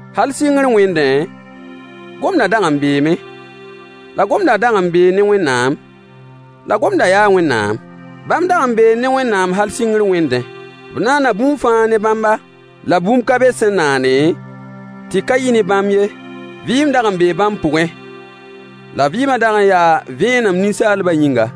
Hal sɩngr wẽndẽ, gomdã dag n beeme, la gomdã dag n bee ne Wẽnnaam, la gomdã yaa Wẽnnaam. Bãmb dag n bee ne Wẽnnaam hal sɩngr wẽndẽ. B naana bũmb fãa ne bãmba, la bũmb ka be sẽn naane, tɩ ka yɩ ne bãmb ye. Vɩɩm dag n bee bãmb pʋgẽ, la vɩɩmã dag n yaa vẽenem ninsaalbã yĩnga.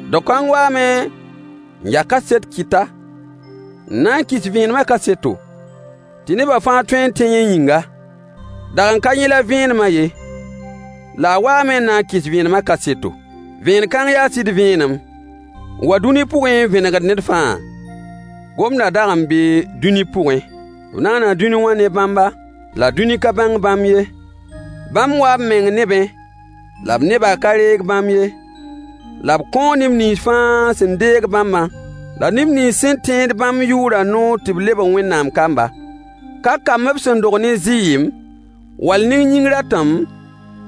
Dao kãng waame n ya kaset kɩta, n na n kɩs vẽenemã kaseto, tɩ neba fãa tõe n tẽ yẽ yĩnga. Dag n ka yẽ la vẽenemã ye, la a waame n na n kɩs vẽenemã kaseto. Vẽen-kãng yaa sɩd vẽenem, n wa dũni pʋgẽ n vẽnegd ned fãa. Gomdã dag n bee dũni pʋgẽ. B naana dũni wã ne bãmba, la dũni ka bãng bãmb ye. Bãmb waa b meng nebẽ, la b nebã ka reeg bãmb ye. La b kõo neb nins fãa sẽn deeg bãmba, la neb nins sẽn tẽed bãmb yʋʋrã noor tɩ b lebg Wẽnnaam kamba. Ka kamb b sẽn dog ne zɩɩm, wall ne yĩng ratem,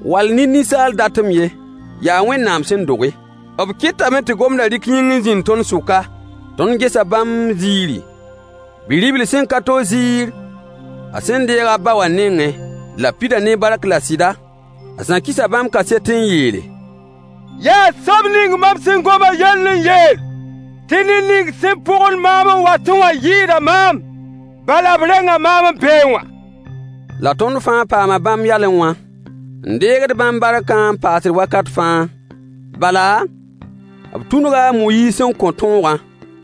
wall ne ninsaal datem ye, yaa Wẽnnaam sẽn doge. B kɩtame tɩ gomdã rɩk yĩng n zĩnd tõnd sʋka. Tõnd gesa bãmb ziiri, Bi-ribl sẽn ka to ziir a sẽn deeg a ba wã nengẽ, la b pida ne bark la sɩda. A Zã kɩsa bãmb kaset n yeele: Yaa soab ning mam sẽn gom a yell n yeel tɩ ned ning sẽn pʋgend maam n watẽ wã yɩɩda maam, bala, b renga maam n beẽ wã. La tõnd fãa paama bãmb yalẽ wã, n deegd bãmb barkã n paasd wakat fãa. Bala, b tũnuga a Moyiis n kõ tõogã,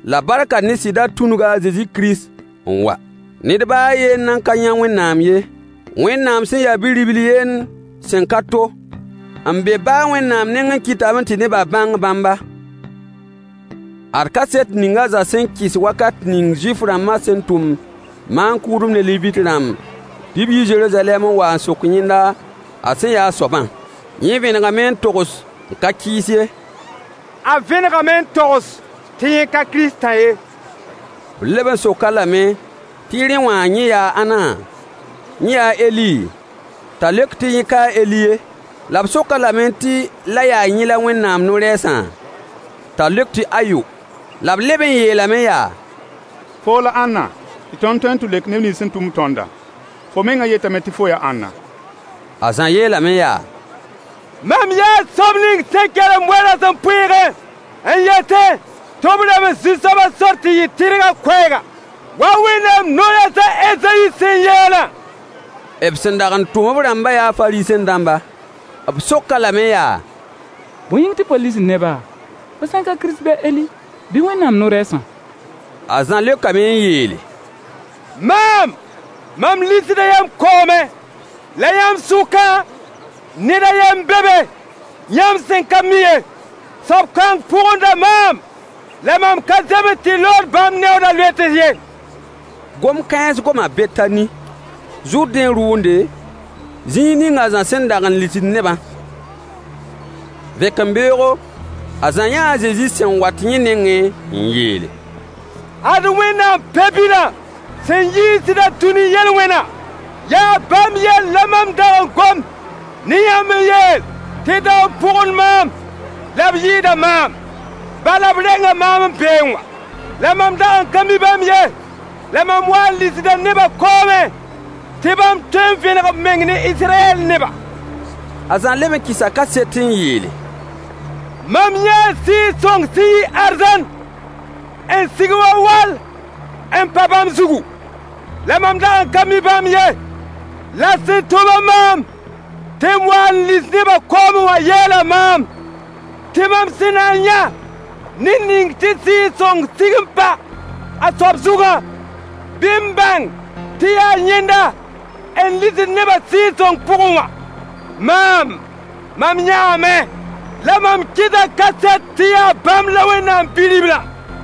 la barkã ne sɩdã tũnuga a Zezi Kirist n wa. Ned baa a yen nan ka yã Wẽnnaam ye. Wẽnnaam sẽn ya Bi-ribl yend sẽn ka to, n be ba a Wẽnnaam nengẽ kɩtame tɩ nebã bãng bãmba. Ad kaset ning a Zã sẽn kɩs wakat ning Zuif-rãmbã sẽn tʋm maan-kʋʋdb ne Levit-rãmb tɩ b yi Zeruzalɛm n wa n sok yẽnda a sẽn yaa a soabã. Yẽ vẽnegame n togs n ka kɩɩs ye. A vẽnegame n togs tɩ yẽ ka Kiristã ye. B leb n sok-a lame tɩ rẽ wã, yẽ yaa ãnna? Yẽ yaa a Eli? T'a leok tɩ yẽ ka a Eli ye. La b sok-a lame tɩ la yaa yẽ la Wẽnnaam no-rɛɛsã? T'a leok tɩ ayo. La b leb n yeelame yaa: Foo la ãnna, tɩ tõnd tõe n tɩ leok neb nins sẽn tʋm-b tõndã? Fo mengã yetame tɩ fo yaa ãnna? A Zã yeelame yaa: “Mam yaa soab ning sẽn kelemd we-rasempʋɩɩgẽ n yetẽ tɩ b rems Zu-soabã sor tɩ yɩ tɩrgã koɛɛga,” wa Wẽnnaam no-rɛɛs a Ezayi sẽn yeelã. B sẽn dag n tʋm b rãmbã yaa Fariisẽ-dãmba. B sok-a lame yaa: Bõe yĩng tɩ fo lisd neba, fo sã n ka Kirist bɩ a Eli bɩ Wẽnnaam no-rɛɛsã? A Zã leokame n yeele: Maam, mam lisda yãmb koomẽ. La yãmb sʋkã, ned a yen n be be yãmb sẽn ka mi ye. Soab kãng pʋgenda maam, la mam ka zems tɩ lood bãmb neooda loets ye. Gom-kãens goma Betani, Zʋrdẽ rʋʋnde, zĩig ning a Zã sẽn dag n lisd nebã. Vẽkembeoogo, a Zã yãa a Zezi sẽn wat yẽ nengẽ, n yeele: Ad Wẽnnaam Pe-bilã, sẽn yiisd-a dũni yel-wẽnã. Yaa bãmb yell la mam dag n gom ne yãmb n yeel tɩ dao n pʋgend maam, la b yɩɩda maam, bala, b renga maam n beẽ wã. La mam dag n ka mi bãmb ye, la mam waa n lisda nebã koomẽ tɩ bãmb tõe n vẽneg b meng ne Israyɛll nebã. A Zã leb n kɩsa kaset n yeele: Mam yãa Sɩɩg-sõng sẽn yi arzãn n sig wa wall n pa bãmb zugu. La mam dag n ka mi bãmb ye. La sẽn tʋm-a maam tɩ m wa n lis nebã koomẽ wã yeela maam tɩ mam sẽn na n yã ned ning tɩ Sɩɩg-sõng sig n pa a soab zugã, bɩ m bãng tɩ yaa yẽnda n lisd nebã Sɩɩg-sõng pʋgẽ wã. Maam, mam yãame, la mam kɩsa kaset tɩ yaa bãmb la Wẽnnaam Bi-riblã.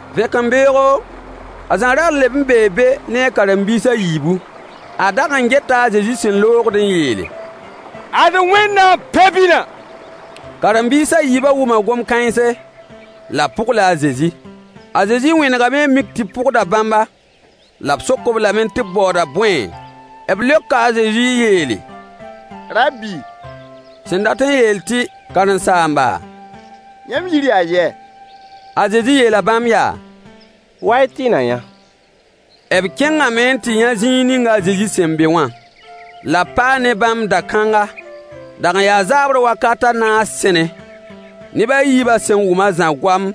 Vẽkembeoogo, a Zã ra leb n bee be ne a karen-biis a yiibu. A dag n geta a Zezi sẽn loogd n yeele: Ad Wẽnnaam Pe-bilã. Karen-biis a yiibã wʋma gom-kãense, la b pʋgla a Zezi. A Zezi wẽnegame n mik tɩ b pʋgda bãmba, la b sok-b lame tɩ b baooda bõe? B leoka a Zezi n yeele: Rabbi, sẽn dat n yeel tɩ karen-saamba, yãmb yir yaa yɛ? A Zezi yeela bãmb yaa: Wa-y tɩ y na yã. B kẽngame n tɩ yã zĩig ning a Zezi sẽn be wã, la b paa ne bãmb da-kãnga. Dag n yaa zaabr wakat a naas sẽne. Neb a yiibã sẽn wʋm a Zã goam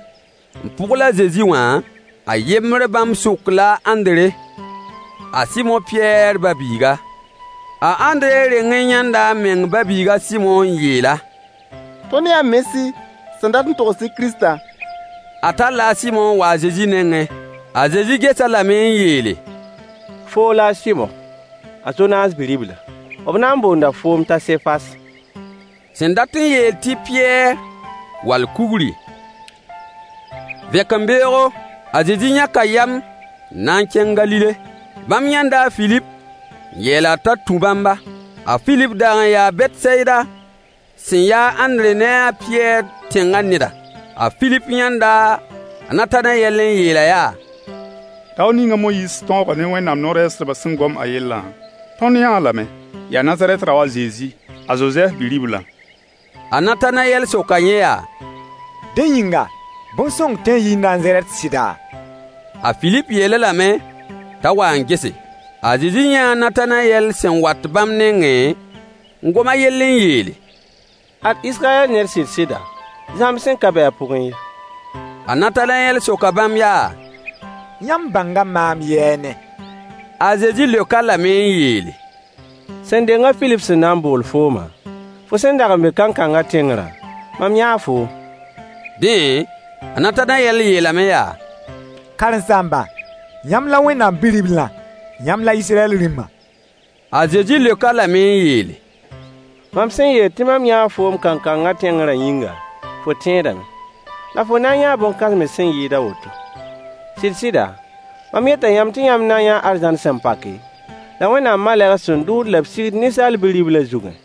n pʋgl a Zezi wã, a yembr bãmb sʋk la a Ãndre, a Sɩmo Pɩyɛɛr ba-biiga. A Ãndre reng n yãnda a meng ba-biig a Sɩmo n yeel-a: Tõnd yãa Mesi, sẽn dat n togs tɩ “Kiristã.” A talla a Sɩmo n wa a Zezi nengẽ. A Zezi ges-a lame n yeele: Foo la a Sɩmo, a Zonaas bi-ribla. B na n boonda foom t'a Sefas, sẽn dat n yeel tɩ Pɩyɛɛr (wall kugri). Vẽkembeoogo, a Zezi yãka yam n na n kẽng Galile. Bãmb yãnda a Filip n yeel-a t'a tũ bãmba. A Filip dag n yaa Betsayida sẽn yaa a Ãndre ne a Pɩyɛɛr tẽngã neda. A Filip yãnda a Natanayɛl n yeel-a yaa: Dao ning a Moyiis tõogã ne Wẽnnaam no-rɛɛsdbã sẽn gom a yellã, tõnd yãa-a lame. Yaa Nazarɛt dao a Zezi, a Zozɛf bi-riblã. A Natanayɛl soka yẽ yaa: Dẽ yĩnga, bõn-sõng tõe n yii Nazarɛt sɩda? A Filip yeel-a lame t'a wa n gese. A Zezi yãa a Natanayɛl sẽn wat bãmb nengẽ, n gom a yell n yeele: Ad Israyɛll ned sɩda, zãmb sẽn ka be a pʋgẽ ye. A Natanayɛl soka bãmb yaa: Yãmb bãnga maam yɛɛne? A Zezi leok-a lame n yeele: Sẽn deng a Filip sẽn na n bool foomã, fo sẽn dag n be kankangã tẽngrã, mam yãa foom. Dẽ, a Natanayɛl yeelame yaa: Karen-saamba, yãmb la Wẽnnaam Bi-riblã! Yãmb la Israyɛll Rĩmã! A Zezi leok-a lame n yeele: Mam sẽn yeel tɩ mam yãa foom kankangã tẽngrã yĩnga, fo tẽedame. La fo na n yãa bõn-kãsems sẽn yɩɩd a woto. Sɩd-sɩda, mam yeta yãmb tɩ yãmb na n yãa arzãn sẽn pake, la Wẽnnaam malegs sẽn dʋʋd la b sigd ninsaal Bi-riblã zugẽ.